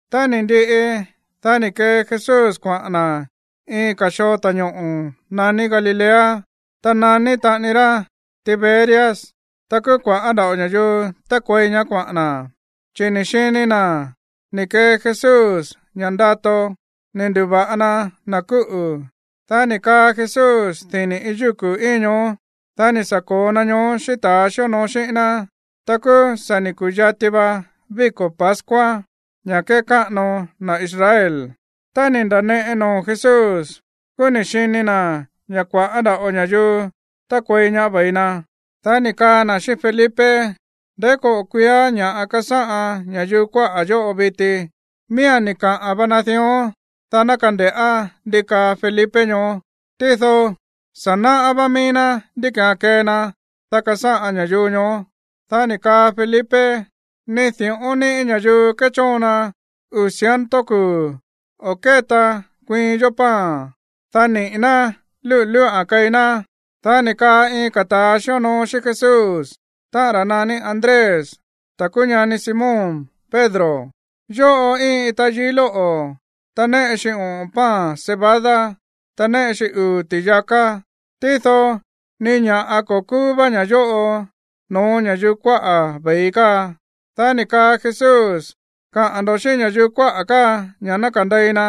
Tá ni̱ ndiꞌi, dá ni̱ kee Jesús kuaꞌa̱n na̱ iin ka̱ xoo ta̱ñoꞌo̱ naní Galilea. Ta naní taꞌani ra Tiberias. Ta kúú kua̱ꞌá nda̱ꞌo ña̱yuu tákuei ñaá kuaꞌa̱n na̱, chi̱ ni̱ xini na̱ ni̱ kee Jesús ña̱ꞌa ndato ni̱ ndu̱va̱ꞌa na na̱ kúꞌu̱. Dá ni̱ kaa Jesús dini̱ iin yúku̱ íin ñoó. Dá ni̱ sa̱ ko̱o na ñoó xíꞌín ta̱a xíonoo xíꞌín ná. Ta kúú sa̱ ni̱ ku̱yati va víko̱ pascua, ña̱ kékáꞌano na̱ Israel. Tá ni̱ nda̱neꞌe noo̱ Jesús, kúú ni̱ xini na̱ ña̱ kua̱ꞌá nda̱ꞌo ña̱yuu tákuei ñaá ve̱i na, dá ni̱ kaa na̱ xíꞌín Felipe: ―¿Ndeí koꞌo̱ kuiiá ña̱ꞌa kasáꞌan ña̱yuu kuaꞌa̱ yóꞌo viti? Míía̱n ni̱ kaꞌa̱n va na dión, dá ná kande̱ꞌá ndi kaa Felipe ñoó. Tído sa̱ náꞌá vá míí ná ndí ki̱án kee na, dá kasáꞌan ña̱yuu ñoó. Dá ni̱ kaa Felipe: ―Ni di̱ꞌón níꞌi̱ ña̱yuu kéchóon na uu̱ ciento kuu̱ o̱ kétaan kuiin yó pan, dá niꞌi̱ ná lúꞌu̱ lúꞌa̱n keí ná. Dá ni̱ kaa iin ka̱ ta̱a xíonoo xíꞌín Jesús, táꞌa̱n ra̱ naní Andrés, ta̱ kúú ñani Simón Pedro: ―Yóꞌo íin iin tayií lóꞌo̱, ta néꞌe xi oꞌo̱n pan cebada, ta néꞌe xi uu̱ ti̱yaká. Tído ni ña̱ꞌa ko̱ kúú vá ña̱ yóꞌo no̱ó ña̱yuu kuaꞌa̱ ve̱i káa. Dá ni̱ kaa Jesús: ―Kaꞌa̱n ndo̱ xíꞌín ña̱yuu kuáꞌa̱ káa ña̱ ná kandei na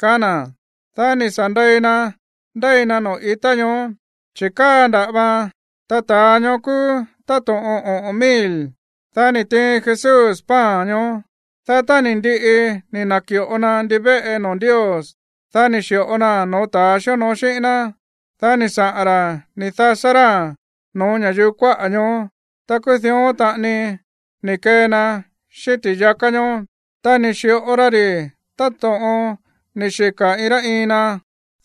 ―kaá na̱. Dá ni̱ sa̱ ndei na ndéi na noo̱ i̱tá ñoó, chi̱ káa nda̱ꞌa vaan. Ta ta̱a ñoó kúú táto̱ꞌon oꞌo̱n mil. Dá ni̱ tiin Jesús pan ñoó. Dá tá ni̱ ndiꞌi ni̱ na̱ki̱ꞌo na ndivéꞌe noo̱ Ndios, dá ni̱ xi̱ꞌo naa̱n no̱ó ta̱ xíonoo xíꞌín ná. Dá ni̱ saꞌa̱n ra̱ ni̱ dasá ráa̱n no̱ó ña̱yuu kuáꞌa̱ ñoó. Ta kúú dión taꞌani ni̱ kee na xíꞌín ti̱yaká ñóó. Ta ni̱ xi̱ꞌo ra ri̱ táto̱ꞌon ni̱ xika̱ iin rá iin na.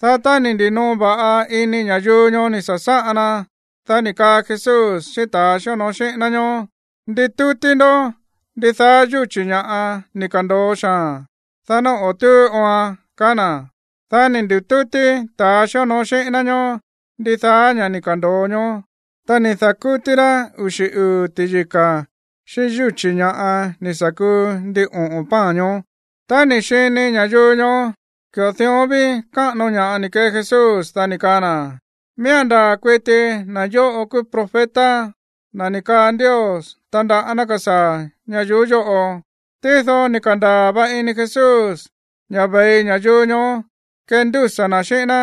Dá tá ni̱ ndi̱noo va̱ꞌa ini ña̱yuu ñoó ni̱ sa̱sáꞌan na, dá ni̱ kaa Jesús xíꞌín ta̱a xíonoo xíꞌín ná ñóó: ―Nditútí ndó ndidaá yúchi̱ ña̱ ni̱ ka̱ndo̱o xaa̱n, dá ná o̱ túú ooan ―kaá na̱. Dá ni̱ ndi̱tútí ta̱ xíonoo xíꞌín ná ñóó ndidaá ña̱ ni̱ ka̱ndo̱o ñoó. Ta ni̱ da̱kútí rá uxi̱ uu̱ ti̱yika̱ xíꞌín yúchi̱ ña̱ ni̱ sa̱ kuu ndin oꞌo̱n pan ñoó. Tá ni̱ xini ña̱yuu ñoó ki̱ꞌo dión ví káꞌano ña̱ꞌa ni̱ kee Jesús, dá ni̱ kaa na̱: ―Miía̱n ndaa̱ kuiti na̱ yóꞌo kúú profeta, na̱ ni̱ kaa Ndios tandaꞌá ná kasaa̱ ñayuú yóꞌo. Tído ni̱ ka̱ndaa̱ va ini Jesús ña̱ ve̱i ña̱yuu ñoó kendúsa̱ na̱ xíꞌín ná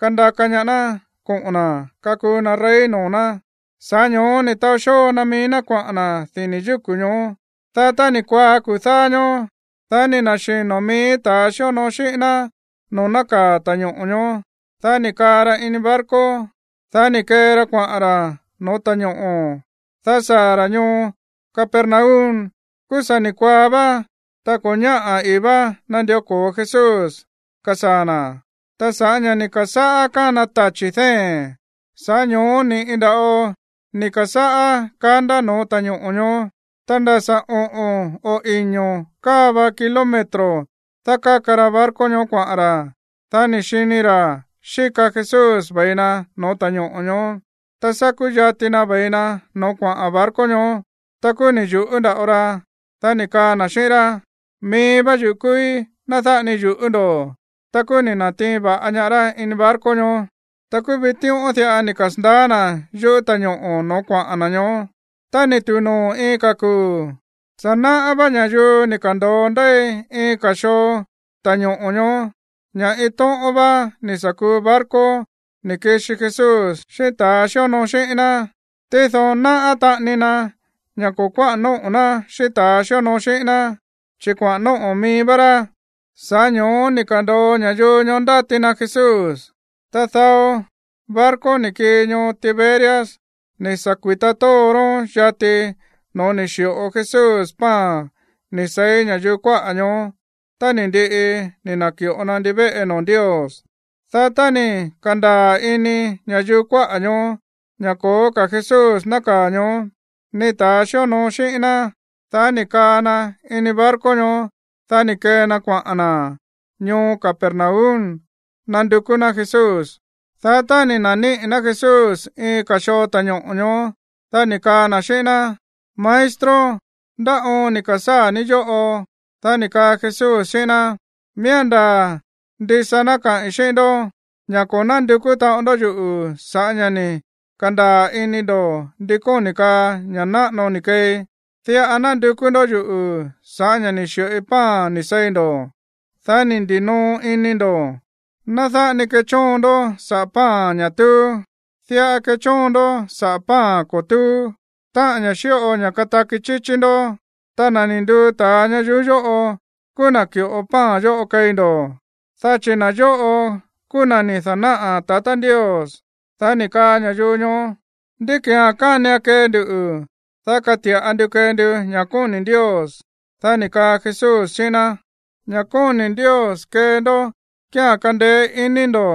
kandaka ñaá ná koꞌo̱n na̱ kakuu na rey noo̱ ná. Sa̱ꞌá ño̱ó ni̱ taó xóo na mií ná kuaꞌa̱n na̱ dini̱ yúku̱ ñoó. Dá tá ni̱ kuaá kuu̱ dáá ñóó, dá ni̱ na̱xino̱ mií ta̱a xíonoo xíꞌín ná noo̱ nákaa̱ ta̱ñoꞌo̱ ñoó. Dá ni̱ kaa ra ini barco, dá ni̱ kee ra kuaꞌa̱n ra̱ no̱ó ta̱ñoꞌo̱, dá saa̱ ra̱ ñoo Capernaum. Kúú sa̱ ni̱ kuaá vá, ta ko̱ ñáꞌa̱ ii̱ va nandió ko̱o Jesús kasaa̱ na̱. Ta sa̱ꞌá ña̱ ni̱ ka̱sáꞌá kána tachi̱ dée̱n, sa̱ꞌá ño̱ó ni̱ꞌi nda̱ꞌo ni̱ ka̱sáꞌá kandá no̱ó ta̱ñoꞌo̱ ñoó. Ta nda̱ sa̱ oꞌo̱n o iño̱ káa va kilómetro dákáka ra barco ñoó kuaꞌa̱n ra̱, dá ni̱ xini ra̱ xíka Jesús ve̱i na no̱ó ta̱ñoꞌo̱ ñoó, ta sa̱ kúyati na ve̱i na no̱ó kuaꞌa̱n barco ñoó. Ta kúú ni̱ yu̱ꞌú nda̱ꞌo ra. Dá ni̱ kaa na̱ xíꞌín rá: ―Mií vá yuꞌu̱ kúúí. Ná dáꞌa ni yu̱ꞌú ndo̱. Ta kúú ni̱ na̱tiin va̱ꞌa ñaá rá ini barco ñoó. Ta kúú vitíꞌón diꞌa ni̱ kasa̱ndaá na̱ yúꞌu̱ ta̱ñoꞌo̱ no̱ó kuaꞌa̱n na̱ ñoó. Tá ni̱ tu̱u noo̱ iin ka̱ kuu̱, sa̱ náꞌá vá ña̱yuu ni̱ ka̱ndo̱o ndéi iin ka̱ xoo ta̱ñoꞌo̱ ñoó ña̱ iin tóꞌón vá ni̱ sa̱ kuu barco ni̱ kixi Jesús xíꞌín ta̱a xíonoo xíꞌín ná. Tído náꞌá taꞌani na ña̱ ko̱ kuáꞌa̱n nóꞌo̱ ná xíꞌín ta̱ xíonoo xíꞌín ná, chi̱ kuaꞌa̱n nóꞌo̱ mií vá rá, sa̱ꞌá ño̱ó ni̱ ka̱ndo̱o ña̱yuu ñoó ndáti na Jesús. Ta dao barco ni̱ kii ñoo Tiberias ni̱ sa̱ kuita tóo ró yati no̱ó ni̱ xi̱ꞌo Jesús pan ni̱ seí ña̱yuu kuáꞌa̱ ñoó tá ni̱ ndiꞌi ni̱ na̱ki̱ꞌo na ndivéꞌe noo̱ Ndios. Dá tá ni̱ ka̱ndaa̱ ini ña̱yuu kuáꞌa̱ ñoó ña̱ ko̱ó ka̱ Jesús nákaa̱ ñoó, ni ta̱a xíonoo xíꞌín ná, dá ni̱ kaa na ini barco ñoó. Dá ni̱ kee na kuaꞌa̱n na̱ ñoo Capernaum nandukú ná Jesús. Dá tá ni̱ na̱níꞌi̱ ná Jesús iin ka̱ xoo ta̱ñoꞌo̱ ñoó, dá ni̱ kaa na̱ xíꞌín ná: ―¿Maestro, ndá oon ni̱ ka̱sáa̱ ní yóꞌo? Dá ni̱ kaa Jesús xíꞌín ná: ―Miía̱n ndaa̱ ndisa ná kaꞌi̱n xíꞌín ndó ña̱ ko̱ nándukú taꞌon ndó yuꞌu̱ sa̱ꞌá ña̱ ni̱ ka̱ndaa̱ ini ndo̱ ndi kóni̱ kaa ña̱ náꞌano ni̱ keei. Diꞌa nándukú ndó yuꞌu̱ sa̱ꞌá ña̱ ni̱ xi̱ꞌoi pan ni̱ seí ndo̱, dá ni̱ ndi̱noo ini ndo̱. Ná dáꞌa ni kechóon ndó saꞌa̱ pan, ña̱ túú. Diꞌa kechóon ndó saꞌa̱ pan ko̱ túú, táꞌa̱n ña̱ xíꞌo ña̱ kataki chíchí ndó. Ta na̱ ni̱ nduu ta̱a ñayuú yóꞌo kúú na̱ ki̱ꞌo pan yóꞌo keí ndo̱, dá chi̱ na̱ yóꞌo kúú na̱ ni̱ da̱náꞌa̱ tatá Ndios. Dá ni̱ kaa ña̱yuu ñoó: ―¿Ndí ki̱án kánian kee ndu, dá kati̱ꞌa ndu kee ndu ña̱ kóni̱ Ndios? Dá ni̱ kaa Jesús xíꞌín ná: ―Ña̱ kóni̱ Ndios kee ndó kía̱n kandeé iní ndo̱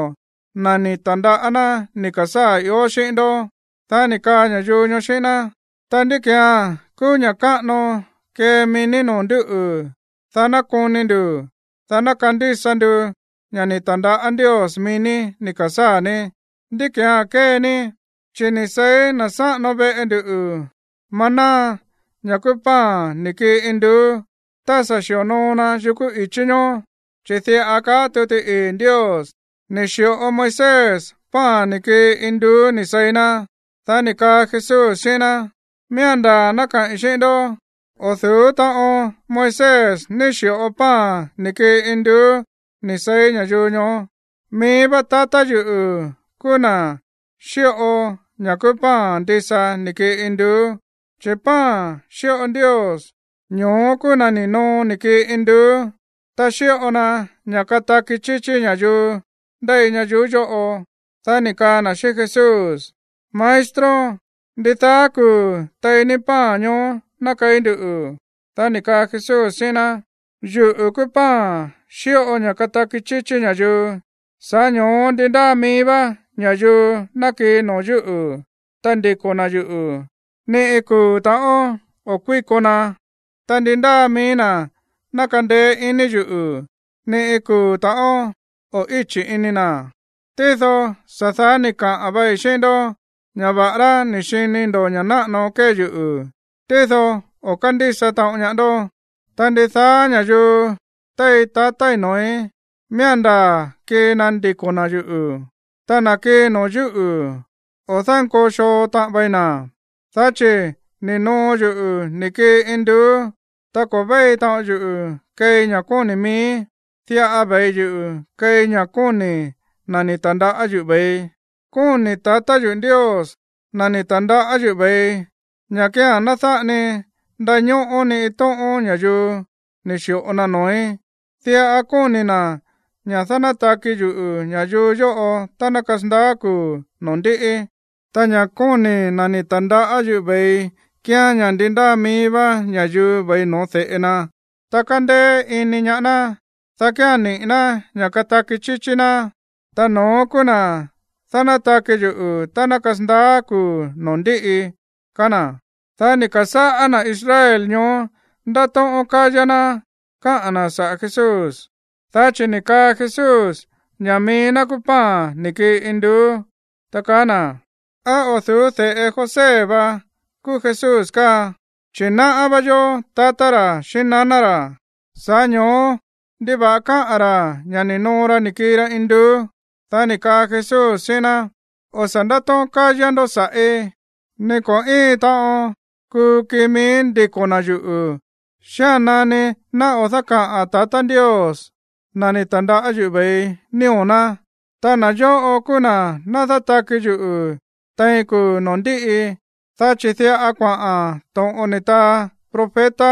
na̱ ni̱ ta̱ndaꞌá ná ni̱ ka̱sáa̱ ió xíꞌín ndó. Dá ni̱ kaa ña̱yuu ñoó xíꞌín ná: ―Ta, ¿ndí ki̱án kúú ña̱ꞌa káꞌano kee mií ní no̱ó nduꞌu̱, dá ná koni ndu̱, dá ná kandísa nduꞌu̱ ña̱ ni̱ ta̱ndaꞌá Ndios mií ní ni̱ ka̱sáa̱ ní? ¿Ndí ki̱án kee ní? Chi̱ ni̱ seí na̱ sáꞌano veꞌe ndu maná, ña̱ kúú pan ni̱ kii induú, tá sa̱ xi̱onoo na yukú i̱chí ñoó. Chi̱ diꞌa kaá tuti ii̱ Ndios: “Ni̱ xi̱ꞌo Moisés pan ni̱ kii induú ni̱ seí na̱.” Dá ni̱ kaa Jesús xíꞌín ná: ―Miía̱n ndaa̱ ná kaꞌi̱n xíꞌín ndó, o̱ du̱ú ta̱ꞌón Moisés ní xi̱ꞌo pan ni̱ kii induú ni̱ seí ña̱yuu ñoó. Mií vá tatá yuꞌu̱ kúú na̱ xíꞌo ña̱ kúú pan ndisa ni̱ kii induú. Chi̱ pan xíꞌo Ndios, ñoó kúú na̱ ni̱ noo ni̱ kii induú, ta xíꞌo na ña̱ kataki chíchí ña̱yuu ndéi ñayuú yóꞌo. Dá ni̱ kaa na̱ xíꞌín Jesús: ―Maestro, ndidaá kuu̱ tei ní pan ñoó ná keí nduꞌu̱. Dá ni̱ kaa Jesús xíꞌín ná: ―Yuꞌu̱ kúú pan xíꞌo ña̱ kataki chíchí ña̱yuu. Sa̱ꞌá ño̱ó ndi ndáa mií vá ña̱yuu ná kii noo̱ yúꞌu̱, ta ndiko̱ na̱ yuꞌu̱, ni iin kuu̱ ta̱ꞌón o̱ kuíko na. Ta ndi ndáa mií na̱ ná kandeé iní yuꞌu̱, ni iin kuu̱ ta̱ꞌón o̱ íchi̱ ini na̱. Tído sa̱ daá ni̱ kaꞌa̱n vai xíꞌín ndó ña̱ va̱ꞌará ni̱ xini ndo̱ ña̱ náꞌano kée yuꞌu̱, tído ko̱ kándísa taꞌon ñaá ndó. Ta ndidaá ña̱yuu tei tatái̱ noo̱í, miía̱n ndaa̱ kii na ndiko̱ na̱ yuꞌu̱. Ta na̱ kii noo̱ yúꞌu̱, o̱ dánkoo xoo taꞌan vei na̱. Dá chi̱ ni̱ noo yuꞌu̱ ni̱ kii induú, ta ko̱ véi taꞌon yuꞌu̱ keei ña̱ kóni̱ miíí, diꞌa ve̱i yuꞌu̱ keei ña̱ kóni̱ na̱ ni̱ ta̱ndaꞌá yuꞌu̱ ve̱ii. Kóni̱ tatá yo̱ Ndios, na̱ ni̱ ta̱ndaꞌá yuꞌu̱ ve̱ii, ña̱ kía̱n ná dáꞌa ni ndañóꞌó ni iin tóꞌón ña̱yuu ni̱ xi̱ꞌo na noo̱í. Diꞌa kóni̱ na̱ ña̱ dánátaki yuꞌu̱ ña̱yuu yóꞌo tá ná kasandaá kuu̱ noo̱ ndíꞌi. Ta ña̱ kóni̱ na̱ ni̱ ta̱ndaꞌá yuꞌu̱ ve̱ii kíán ña̱ ndi ndáa mií vá ña̱yuu ve̱i no̱ó de̱ꞌe na, ta kándéé iní ñaá ná, dá kía̱n niꞌi̱ ná ña̱ kataki chíchí ná. Ta no̱ón kúú na̱ dánátaki yuꞌu̱ tá ná kasandaá kuu̱ noo̱ ndíꞌi ―kaá na̱. Dá ni̱ ka̱sáꞌá na̱ Israel ñoó ndátóꞌón kayá ná káꞌa̱n na̱ saꞌa̱ Jesús, dá chi̱ ni̱ kaa Jesús ña̱ mií ná kúú pan ni̱ kii induú, ta kaá na̱: ―¿Á o̱ du̱ú de̱ꞌe José va kúú Jesús káa, chi̱ náꞌá vá yó tatá ra̱ xíꞌín naná ra̱? Sa̱ꞌá ño̱ó, ¿ndiva̱ꞌa káꞌa̱n ra̱ ña̱ ni̱ noo ra ni̱ kii ra induú? Dá ni̱ kaa Jesús xíꞌín ná: ―O̱ sa̱ ndátóꞌón kayá ndo̱ sa̱ꞌí. Ni ko̱ íin taꞌon kuu kii mií ndiko̱ na̱ yuꞌu̱ xía̱n nani ná o̱ dákaꞌa̱n tatá Ndios, na̱ ni̱ ta̱ndaꞌá yuꞌu̱ ve̱ii, nío̱ ná. Ta na̱ yóꞌo kúú na̱ dánátaki yuꞌu̱ tein kuu̱ noo̱ ndíꞌi. Dá chi̱ diꞌa kuaꞌa̱n to̱ꞌon ni̱ taa profeta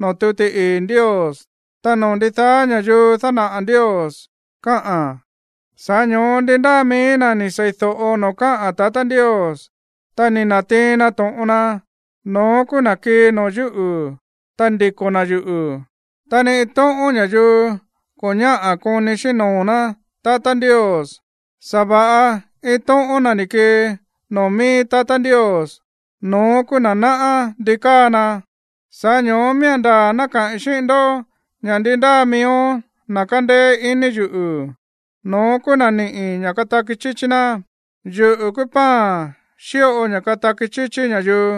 noo̱ tuti ii̱ Ndios: “Ta noo̱ ndidaá ña̱yuu dánaꞌa̱ Ndios”, kaáa̱n. Sa̱ꞌá ño̱ó ndi ndáa mií na̱ ni̱ seídóꞌo noo̱ káꞌa̱n tatá Ndios, ta ni̱ na̱tiin na to̱ꞌon na, no̱ón kúú na̱ kii noo̱ yúꞌu̱, ta ndiko̱ na̱ yuꞌu̱. Ta ni iin tóꞌón ña̱yuu ko̱ ñáꞌa̱ koni xíꞌín noo̱ ná tatá Ndios, sa̱va̱ꞌa iin tóꞌón na̱ ni̱ kii noo̱ mií tatá Ndios, no̱ón kúú na̱ náꞌá ndi káa na. Sa̱ꞌá ño̱ó miía̱n ndaa̱ ná kaꞌi̱n xíꞌín ndó ña̱ ndi ndáa miíó na̱ kandeé iní yuꞌu̱, no̱ón kúú na̱ ni̱ꞌí ña̱ kataki chíchí ná. Yuꞌu̱ kúú pan xíꞌo ña̱ kataki chíchí ña̱yuu.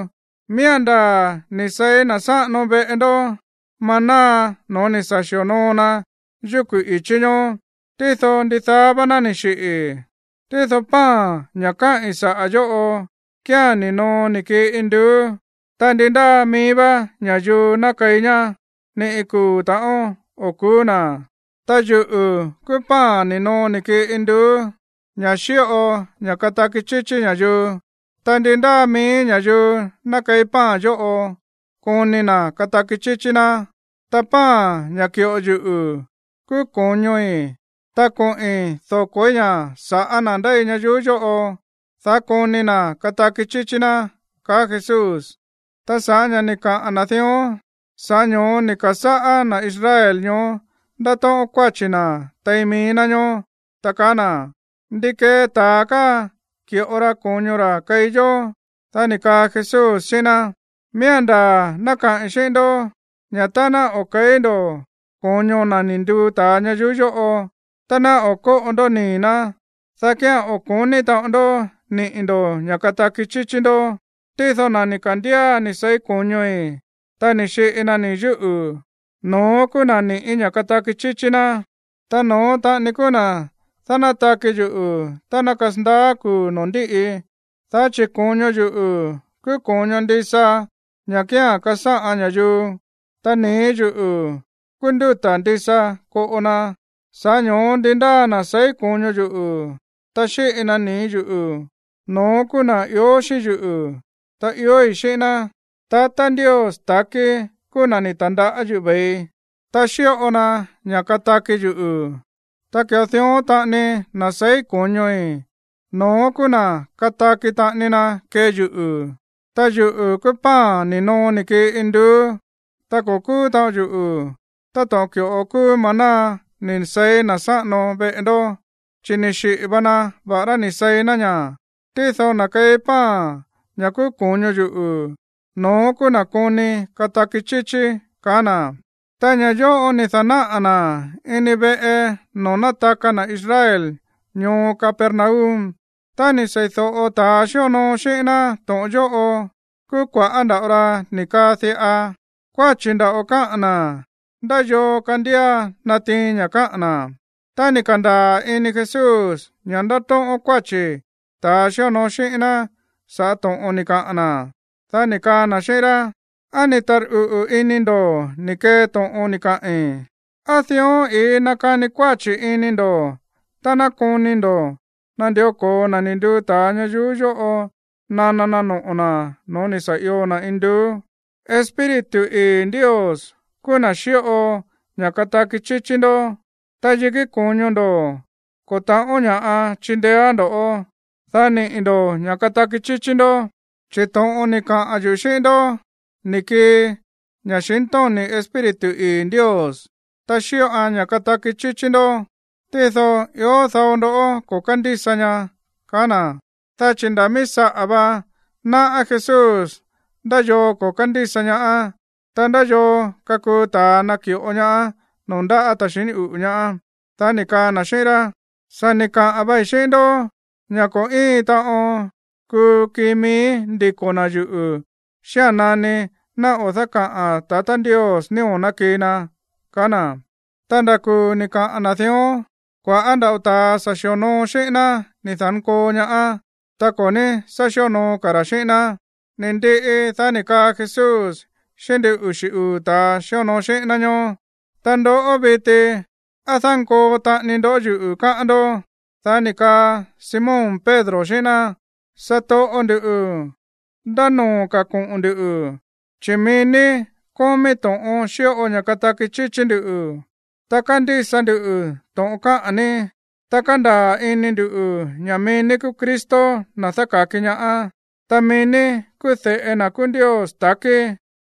Miía̱n ndaa̱ ni̱ seí na̱ sáꞌano veꞌe ndó maná no̱ó ni̱ sa̱ xi̱onoo na yukú i̱chí ñoó, tído ndidaá vá ná ni̱ xiꞌi̱. Tído pan, ña̱ káꞌi̱n saꞌa̱ yóꞌo, kía̱n ni̱ noo ni̱ kii induú. Ta ndi ndáa mií vá ña̱yuu ná keí ñá, ni iin kuu̱ ta̱ꞌón o̱ ku̱ú na̱. Ta yuꞌu̱ kúú pan ni̱ noo ni̱ kii induú, ña̱ xíꞌo ña̱ kataki chíchí ña̱yuu. Ta ndi ndáa mií ña̱yuu ná keí pan yóꞌo, koni na̱ kataki chíchí ná. Ta pan, ña̱ ki̱ꞌo yuꞌu̱, kúú ko̱ñoi̱. Ta koꞌi̱n doko̱í ña̱ sa̱ꞌá na̱ ndéi ñayuú yóꞌo, dá koni na̱ kataki chíchí ná ―kaá Jesús. Ta sa̱ꞌá ña̱ ni̱ kaꞌa̱n na̱ dión, sa̱ꞌá ño̱ó ni̱ ka̱sáꞌá na̱ Israel ñoó ndátóꞌón kuáchi̱ na̱ tein mií ná ñoó, ta kaá na̱: ―¿Ndi kee ta̱a káa ki̱ꞌo ra ko̱ño ra̱ keí yó? Dá ni̱ kaa Jesús xíꞌín ná: ―Miía̱n ndaa̱ ná kaꞌi̱n xíꞌín ndó ña̱ tá ná o̱ ke̱í ndo̱ ko̱ño na̱ ni̱ nduu ta̱a ña̱yuu yóꞌo, ta ná o̱ kóꞌo ndó nii̱ ná, dá kía̱n o̱ ko̱ní taꞌon ndó niꞌi̱ ndo̱ ña̱ kataki chíchí ndó. Tído na̱ ni̱ ka̱ndía ni̱ seí ko̱ñoi̱, ta ni̱ xiꞌi na nii̱ yúꞌu̱, no̱ón kúú na̱ ni̱ꞌí ña̱ kataki chíchí ná. Ta no̱ón taꞌani kúú na̱ dánátaki yuꞌu̱ tá ná kasandaá kuu̱ noo̱ ndíꞌi. Dá chi̱ ko̱ño yuꞌu̱ kúú ko̱ño ndisa, ña̱ kía̱n kasáꞌan ña̱yuu, ta nii̱ yúꞌu̱ kúú ndúta̱ ndisa koꞌo na. Sa̱ꞌá ño̱ó ndi ndáa na̱ seí ko̱ño yuꞌu̱, ta xíꞌi na nii̱ yúꞌu̱, no̱ón kúú na̱ ió xíꞌín yuꞌu̱, ta iói̱ xíꞌín ná. Tatá Ndios takí kúú na̱ ni̱ ta̱ndaꞌá yuꞌu̱ ve̱ii, ta xíꞌo na ña̱ kataki yuꞌu̱. Ta ki̱ꞌo dión taꞌani, na̱ seí ko̱ñoi̱, no̱ón kúú na̱ kataki taꞌani na kee yuꞌu̱. Ta yuꞌu̱ kúú pan ni̱ noo ni̱ kii induú. Ta ko̱ kúú taꞌon yuꞌu̱ táto̱ꞌon ki̱ꞌo kúú maná ni̱ seí na̱ sáꞌano veꞌe ndó, chi̱ ni̱ xiꞌi̱ va na va̱ꞌará ni̱ seí na̱ ñá. Tído na̱ keí pan, ña̱ kúú ko̱ño yuꞌu̱, no̱ón kúú na̱ koni kataki chíchí ―kaá na̱. Ta ña̱ yóꞌo ni̱ da̱náꞌa̱ na̱ ini veꞌe noo̱ nátaka na̱ Israel ñoo Capernaum. Tá ni̱ seídóꞌo ta̱a xíonoo xíꞌín ná to̱ꞌon yóꞌo, kúú kua̱ꞌá nda̱ꞌo ra ni̱ kaa diꞌa: ―Kuáchi̱ nda̱ꞌo káꞌa̱n na̱. ¿Ndá yoo kandía natiin ña̱ káꞌa̱n na̱? Tá ni̱ ka̱ndaa̱ ini Jesús ña̱ ndátóꞌón kuáchi̱ ta̱ xíonoo xíꞌín ná sa̱ꞌá to̱ꞌon ni̱ kaꞌa̱n na̱, dá ni̱ kaa na̱ xíꞌín rá: ―¿Á ni̱ tarꞌuꞌu̱ ini ndo̱ ni̱ kee to̱ꞌon ni̱ kaꞌi̱n? ¿Á dión i̱í nakani kuáchi̱ ini ndo̱ tá ná koni ndo̱ nandió ko̱o na̱ ni̱ nduu ta̱a ña̱yuu yóꞌo nana na noꞌo̱ na̱ no̱ó ni̱ sa̱ io na̱ induú? Espíritu ii̱ Ndios kúú na̱ xíꞌo ña̱ kataki chíchí ndó, ta yikí ko̱ño ndo̱ ko̱ ta̱ꞌón ña̱ꞌa chindeéán ndo̱, dá niꞌi̱ ndo̱ ña̱ kataki chíchí ndó. Chi̱ to̱ꞌon ni̱ kaꞌa̱n yuꞌu̱ xíꞌín ndó ni̱ kii ña̱xintóni̱ Espíritu ii̱ Ndios, ta xíꞌoan ña̱ kataki chíchí ndó. Tído ió dao ndó ko̱ kándísa ñaá ―kaá na̱. Dá chi̱ ndá mií saꞌa̱ va náꞌá Jesús ndá yoo ko̱ kándísa ñaá, ta ndá yoo kakuu ta̱a naki̱ꞌo ñaá noo̱ ndáꞌa̱ ta̱ xiní uꞌu̱ ñaá. Dá ni̱ kaa na̱ xíꞌín rá: ―Sa̱ ni̱ kaꞌa̱n vai xíꞌín ndó ña̱ ko̱ íin taꞌon kuu kii mií ndiko̱ na̱ yuꞌu̱ xía̱n nani ná o̱ dákaꞌa̱n tatá Ndios nío̱ ná kii na ―kaá na̱. Ta ndá kuu̱ ni̱ kaꞌa̱n na̱ dión, kua̱ꞌá nda̱ꞌo ta̱ sa̱ xi̱onoo xíꞌín ná ni̱ da̱nkoo ñaá, ta ko̱ ní sá xionoo ka̱ ra̱ xíꞌín ná. Ni̱ ndiꞌi, dá ni̱ kaa Jesús xíꞌín ndin uxi̱ uu̱ ta̱a xíonoo xíꞌín ná ñoó: ―¿Ta ndoꞌó viti? ¿Á dánkoo taꞌani ndó yuꞌu̱, káꞌán ndó? Dá ni̱ kaa Simón Pedro xíꞌín ná: ―Satoꞌo ndu̱, ¿ndá noo̱ ka̱ koꞌo̱n ndu̱? Chi̱ mií ní kómí to̱ꞌon xíꞌo ña̱ kataki chíchí ndú. Ta kándísa ndu to̱ꞌon káꞌa̱n ní, ta kándaa̱ ini ndu̱ ña̱ mií ní kúú Cristo, na̱ dáka̱ki ñaá, ta mií ní kúú de̱ꞌe na̱ kúú Ndios takí.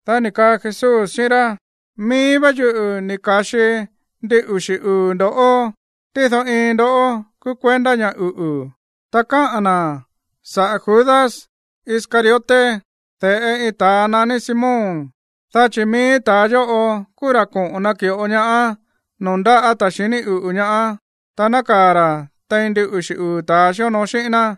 Dá ni̱ kaa Jesús xíꞌín rá: ―Mií vá yuꞌu̱ ni̱ ka̱xi ndin uxi̱ uu̱ ndo̱ꞌó, tído iin ndoꞌó kúú kuendá ña̱ uꞌu̱. Ta káꞌa̱n na̱ saꞌa̱ Judas Iscariote, de̱ꞌe iin ta̱a naní Simón, dá chi̱ mií ta̱a yóꞌo kúú ra̱ koꞌo̱n naki̱ꞌo ñaá noo̱ ndáꞌa̱ ta̱ xiní uꞌu̱ ñaá, ta nákaa̱ ra̱ tein ndin uxi̱ uu̱ ta̱a xíonoo xíꞌín ná.